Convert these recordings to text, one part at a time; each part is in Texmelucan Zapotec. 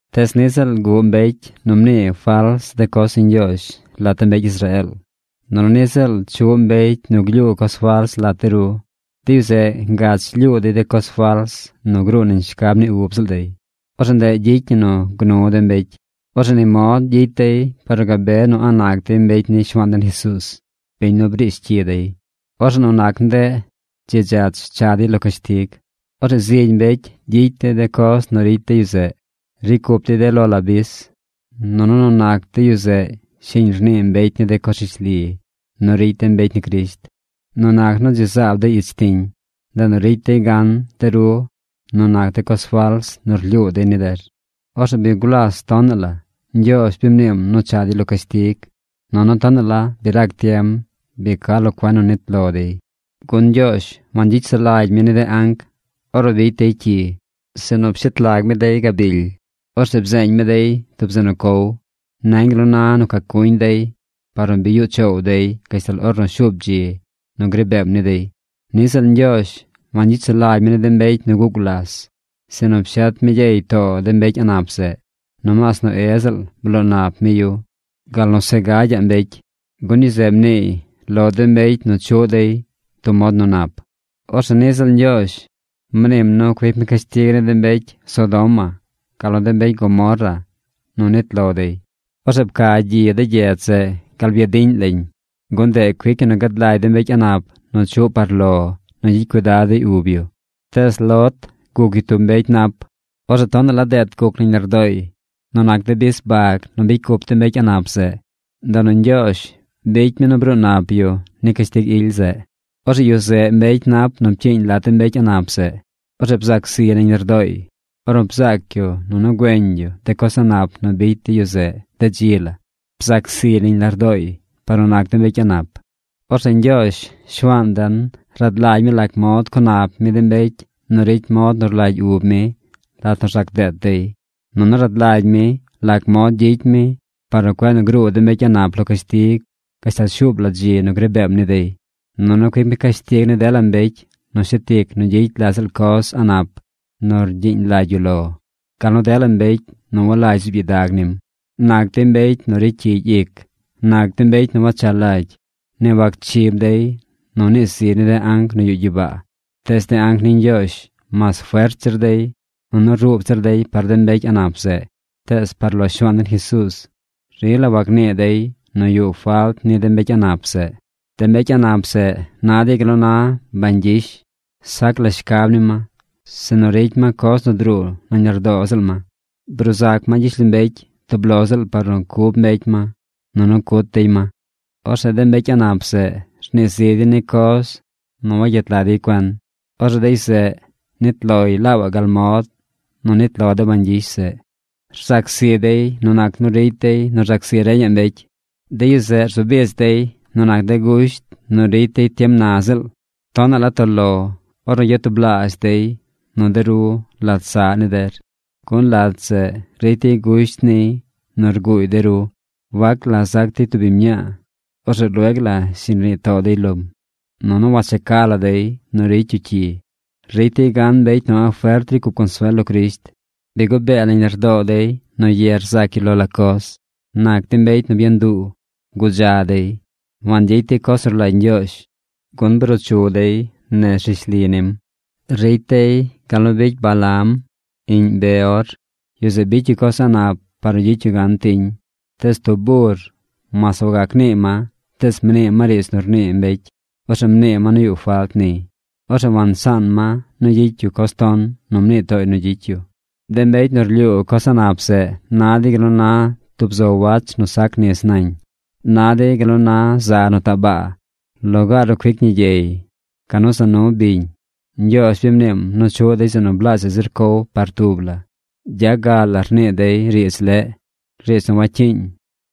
Tees niꞌ ziꞌl guꞌ mbecy nu mnii fals de coz ni Ñgyoozh lat de mbecy Israeel, nunu niꞌ ziꞌl chuꞌ mbecy nu glyuu coz fals lat de ru. De yu zeꞌ ngach lyuu dey de coz fals nu gruu nañ shcab ni ub ziꞌl dey. Orzeꞌ ndeꞌ gyicy ñi nu gnu de mbecy. Orzeꞌ ni mod gyicy dey par nu gabe nu a̱ꞌ nac dey mbecy ni Shuaan den Jesuuz, biñ nu briish cyi dey. Orzeꞌ nu nac nu ndeꞌ dzi dzach cha dey lo cashtig. Orzeꞌ zigy mbecy gyicy dey de coz nu ricy de yu zeꞌ. Ricy cup dey de lo la bis. Nunu nu nac de yu zeꞌ shiñ rnii mbecy ni de coz rishli nu ricy de mbecy ni Crisht. Nu nac nu dzi zaab dey ich tiñ, ndeꞌ nu ricy dey gan de ru nu nac de coz fals nu rlyuu dey ni der. Orzeꞌ bi gulas tonaꞌ la Ñgyoozh bi mniim nu cha dey lo cashtig, nunu tonaꞌ la bi rac tiem bi ca lo cuen nu nit lo dey. Gun Ñgyoozh wangyicy sulagy mi ni de anc ornu bicy dey cyi, sinu pshet lag mi dey gabily. Orzeꞌ bzeeñ mi dey tub zeꞌ nu cow. Nañ gal nu na nu cacuñ dey par nu bi yuꞌ choow dey gashtal ornu shuub dzi nu gri beem ni dey. Niꞌ ziꞌl Ñgyoozh wangyicy sulagy mi ni de mbecy nu guꞌ gulas, sinu pshet mi gyey too de mbecy a̱ꞌ nap zeꞌ. Nomaas Noé ziꞌl bloo nap mi yu, gal nu se gagy mbecy, gun yu zeꞌ mniiy lo de mbecy nu chuꞌ dey tub mod nu nap. Orzeꞌ niꞌ ziꞌl Ñgyoozh mniim nu cuic mi cashtig ni de mbecy Sodoma gal nu de mbecy Gomorra nu nit lo dey. Orzeꞌ pca gyi de gyedz zeꞌ gal byadiꞌñ lañ, gun ndeꞌ cuic ñi nu gad lagy de mbecy a̱ꞌ nap nu chuꞌ par lo nu gyicy cuidad dey ub yu. Tees Lot guc yu tub mbecy nap. Orzeꞌ tonaꞌ la deet guc nañ lardooy nu nac de bis bag nu bicy cup de mbecy a̱ꞌ nap zeꞌ. Ndeꞌ nu Ñgyoozh bicy mi nu bruu nap yu ni cashtig ily zeꞌ. Orzeꞌ yu zeꞌ mbecy nap nu pcyiiñ lat de mbecy a̱ꞌ nap zeꞌ. Orzeꞌ bzac ziy nañ lardooy ornu bzaac yu nunu güeñ yu de coz a̱ꞌ nap nu bicy de yu zeꞌ de dzi la. Bzac ziy nañ lardooy par nu nac de mbecy a̱ꞌ nap. Orzeꞌ Ñgyoozh Shuaan den rad lagy mi lac mod co nap mi de mbecy nu ricy mod nu rlagy ub mi lat nu rzac deet dey. Nunu rad lagy mi lac mod gyicy mi par nu cueꞌ gruu de mbecy a̱ꞌ nap lo cashtig gashtal shuub la dzi nu gri beem ni dey. Nunu cuic mi cashtig ni dela mbecy nu shet ic nu gyicy la ziꞌl coz a̱ꞌ nap nu rgyiiñ lagy yu lo, gal nu dela mbecy nu walagy zuub gyidag nim. Nac dey mbecy nu ricy cyigy ic. Nac dey mbecy nu wacha lagy. Ni wacchib dey nu nii ziy ni de anc nu yuꞌ gyibaa. Tees de anc ni Ñgyoozh, mas fert zir dey nunu ruub zir dey par de mbecy a̱ꞌ nap zeꞌ, tees par lo Shuaan den Jesuuz, rila wagnii dey nu yuꞌ falt ni de mbecy a̱ꞌ nap zeꞌ. De mbecy a̱ꞌ nap zeꞌ na dey gal nu na bañ gyish. Sac la shcab ni ma, sinu ricy ma coz nu druu nañ lardoo ziꞌl ma. Bruu zac ma gyishlombecy tub lo ziꞌl par nu cub mbecy ma, nunu cut dey ma. Orzeꞌ de mbecy a̱ꞌ nap zeꞌ rnii zi dey ni coz nu wagyet lag dey cuen. Orzeꞌ de yu zeꞌ nit loy laabaꞌ gal mod nu nit lo de bañ gyish zeꞌ. Rzac zi dey nu nac nu ricy dey nu rzac zi reñaꞌ mbecy. De yu zeꞌ rzu bich dey nu nac de gusht nu ricy dey tiem na ziꞌl. ¡Tonaꞌ la toꞌ lo ornu yatublaazh dey nu de ru lat saꞌ ni der, gun lat zeꞌ ricy dey gusht niy nu rguuy de ru! Wac la zac dey tub biñ mñaa, orzeꞌ lueg la shiñ rnii too dey lom. Nunu wacheca la dey nu ricy yu cyi. Ricy dey gan mbecy nu a̱ꞌ fert ricy cup consuel lo Crisht. Bi gubee nañ lardoo dey nu ye rzac yu lo la coz. Nac dey mbecy byanduu. Gudza dey. Wangyicy dey coz nu rlagy Ñgyoozh, gun bruu chu dey nez rishli nim. Ricy dey gal nu bicy Balaam, iꞌñ Beor. Yu zeꞌ bicy yu coz a̱ꞌ nap par nu gyicy yu gan tiñ. Tees tub bur, mas wagac nii ma, tees mnii ma riidz nu rnii mbecy. Orzeꞌ mnii ma nu yuꞌ falt niy. Orzeꞌ wansaan ma nu gyicy yu coz ton nu mnii tooy nu gyicy yu. De mbecy nu rlyuu coz a̱ꞌ nap zeꞌ na dey gal nu na tub zo wach nu sac nis nañ. Na dey gal nu na za nu taꞌ baa, lugaar nu cuic ñi gyey, canu za nu biñ. Ñgyoozh bi mniim nu chuꞌ dey zeꞌ nu blaazhaꞌ zir cow par tub la. Gya ga la rnii dey riidz leꞌ, riidz nu wacyiiñ.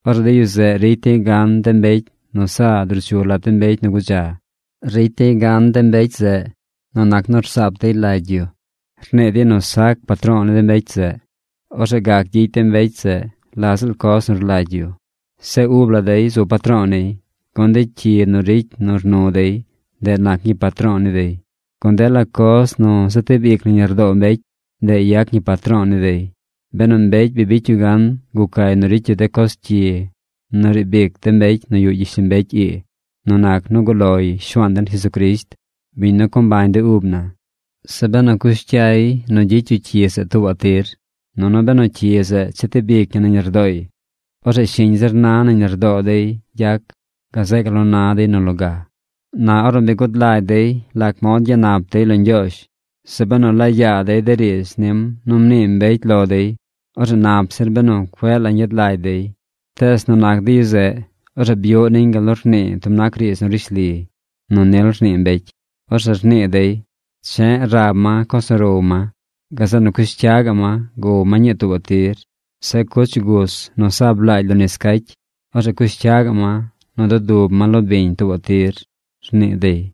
Orzeꞌ de yu zeꞌ ricy dey gan de mbecy nu sa druu chu lat de mbecy nu gudza. Ricy dey gan de mbecy zeꞌ nu nac nu rsaap dey lagy yu. Rnii dey nu sac patro̱o̱ ni de mbecy zeꞌ. Orzeꞌ gac gyicy de mbecy zeꞌ la ziꞌl coz nu rlagy yu. Zeꞌ ub la dey zu patro̱o̱ niy, gun de cyi nu ricy nu rnu dey, ndeꞌ nac ñii patro̱o̱ ni dey. Gun dela coz nu zetib ic nañ lardoo mbecy, ndeꞌ yac ñii patro̱o̱ ni dey. Benu mbecy bi bicy yu gan gucay nu ricy yu de coz cyi nu riib ic de mbecy nu yuꞌ gyishlombecy ii nu nac nu guꞌ loy Shuaan den Jesucrisht, biñ nu co mbañ de ub na, zeꞌ benu cush cyay nu gyicy yu cyi zeꞌ tuubaꞌ tir, nunu benu cyi zeꞌ chetib ic ñi nañ lardooy, orzeꞌ shiñ zir na nañ lardoo dey gyac gazeꞌ gal nu na dey nu loga. Na ornu bi gud lagy dey lac mod gyanap dey lo Ñgyoozh, zeꞌ benu laa yaa dey de riidz nim nu mnii mbecy lo dey, orzeꞌ nap zir benu cueꞌ la ñgyad lagy dey. Tees nu nac de yu zeꞌ, orzeꞌ byuꞌ niñ gal nu rnii tub nac riidz nu rishli nu nil rnii mbecy. Orzeꞌ rnii dey: “Che̱ꞌ rab ma coz nu row ma. Gazeꞌ nu cush cya gaꞌ ma gow ma ñii tuubaꞌ tir. Zeꞌ cuch gus nu sa blaagy lo nis cacy, orzeꞌ cush cya gaꞌ ma nu dudub ma lo biñ tuubaꞌ tir”, rnii dey.